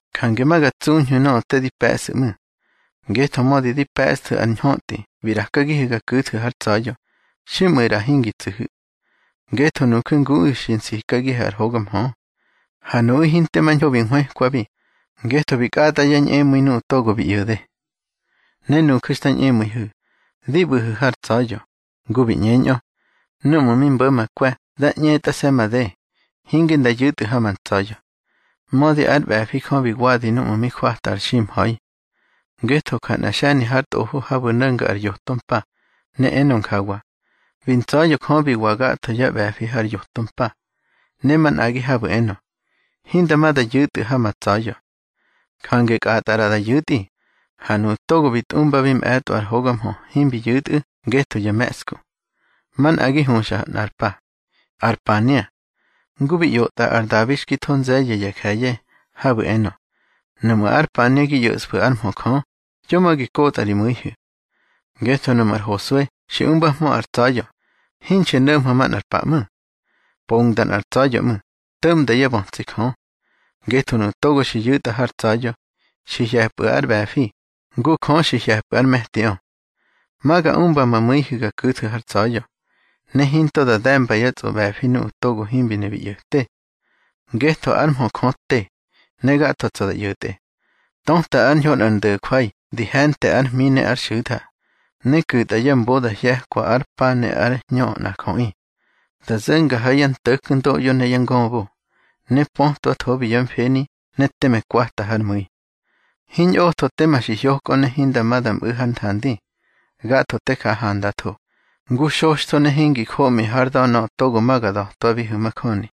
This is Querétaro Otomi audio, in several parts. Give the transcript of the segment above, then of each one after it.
Jange ma ga tsuñhu̱ nöꞌö te di pe̱ꞌsu̱ ꞌmu̱. Ngetho mödi di pe̱ꞌsthu̱ ar ñhötꞌi bi ꞌrakagihu̱ ga ku̱thu̱ hár tsa̱ya̱, xiꞌmu̱ ꞌra hingi tsu̱hu̱. Ngetho nuju̱ nguꞌu̱ xi nsikagihu̱ ar hoga mhö. Ha nuꞌu̱ hinte mañho bi nhwëkwabi, ngetho bi kꞌatꞌa yá ñꞌemu̱i nuꞌu̱ togo bi ꞌyo̱de. Ne nuju̱ xta ñꞌemu̱ihu̱, di ꞌbu̱hu̱ hár tsa̱ya̱, ngu bi ꞌñeñꞌö: Númꞌu̱ mi mbo̱ ma kwe̱ da ꞌñetꞌase̱ made, hinge nda yu̱tꞌu̱ ha ma tsa̱ya̱. Mödi ár ꞌbe̱fi Jö bi wadi núꞌmu̱ mi jwata ar ximha̱i. Ngetho ja nꞌa xe̱ni har tꞌofo habu̱ no̱nga ar yoto mpa, ne enga njawa: Bi ntsa̱ya̱ Jö bi wa gatho yá ꞌbe̱fi har yoto mpa. Ne manꞌagi habu̱ enö: Hinda ma da yu̱tꞌu̱ ha ma tsa̱ya̱. Jange kꞌatꞌa ꞌra da yu̱tꞌi, ha nuꞌu̱ togo bi tꞌumbabi mꞌe̱tꞌo ar hoga mhö himbi yu̱tꞌu̱ ngetho ya me̱ꞌsku. Manꞌagi huxa nꞌar pa: ar pania. Ngu bi ꞌyotꞌa ar Dabi xki tho nze̱ye̱ ya je̱ye̱, habu̱ enö: Nuꞌmu̱ ar pania gi ꞌyo̱ꞌsfu̱ ár mhö Jö, yo ma gi kotꞌa ri mu̱ihu̱. Ngetho nuꞌmu̱ ar Hosue xi umbahmö ar tsa̱ya̱, hinxi no̱mhö manꞌar pa ꞌmu̱. Pongda nꞌar tsa̱ya̱ ꞌmu̱, to̱ꞌma yá bötsi Jö. Ngetho nuꞌu̱ togo xi yu̱tꞌa hár tsa̱ya̱, xi hye̱pꞌu̱ ár ꞌbe̱fi, ngu Jö xi hye̱pꞌu̱ ár me̱tiꞌö. Ma ga umba ma mu̱ihu̱ ga ku̱thu̱ har tsa̱ya̱, ne hinto da de̱mba yá tsꞌoꞌbe̱fi nuꞌu̱ togo himbi ne bi ꞌyo̱te. Ngetho ár mhö Jö te, ne gatho tsa̱ da ꞌyo̱tꞌe. Töta ár ñho nꞌar ndo̱jwai di he̱nte ár hmi ne ár xu̱tha, ne ku̱tꞌa ya mbo da hye̱kwa ár pa ne ár hñö nꞌar jöꞌi. Da zo̱nga ha yá nto̱kndoꞌyo ne yá ngöbo, ne pötwathobi yá mfeni ne teme kwata hár mu̱i. Hiñꞌotho tema xi hyokꞌö ne hinda ma da mꞌu̱ hár nthandi. Gatho te ja handatho, ngu xoxtho ne hingi joꞌmi hár da̱ nöꞌö togo ma ga da̱twabihu̱ majöni.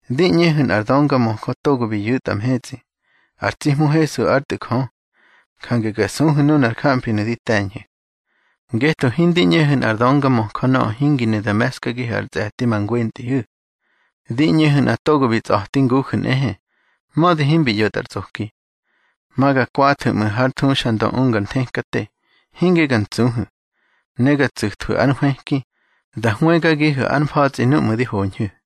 Di ꞌñehu̱ nꞌar döngamöjö togo bi yu̱tꞌa mhetsꞌi, ar tsi Hmu Hesu ár Tꞌu̱ Jö. Jange ga suhu̱ nunar jamfinu̱ di te̱ñhu̱. Ngetho hindi ꞌñehu̱ nꞌar döngamöjö nöꞌö hingi ne da me̱skagihu̱ ar tse̱ti ma ngwentꞌihu̱. Di ꞌñehu̱ nꞌa togo bi tsꞌa̱ti nguju̱ nꞌehe, mödi himbi ꞌyo̱tꞌa ar tsꞌoki. Ma ga kwathu̱ ꞌmu̱ hár thuxandö unga ar nthekate, hinge ga ntsuhu̱. Ne ga tsu̱thwu̱ ár nhwëki, da hwëgagihu̱ ár mfa̱tsꞌi núꞌmu̱ di hoñhu̱.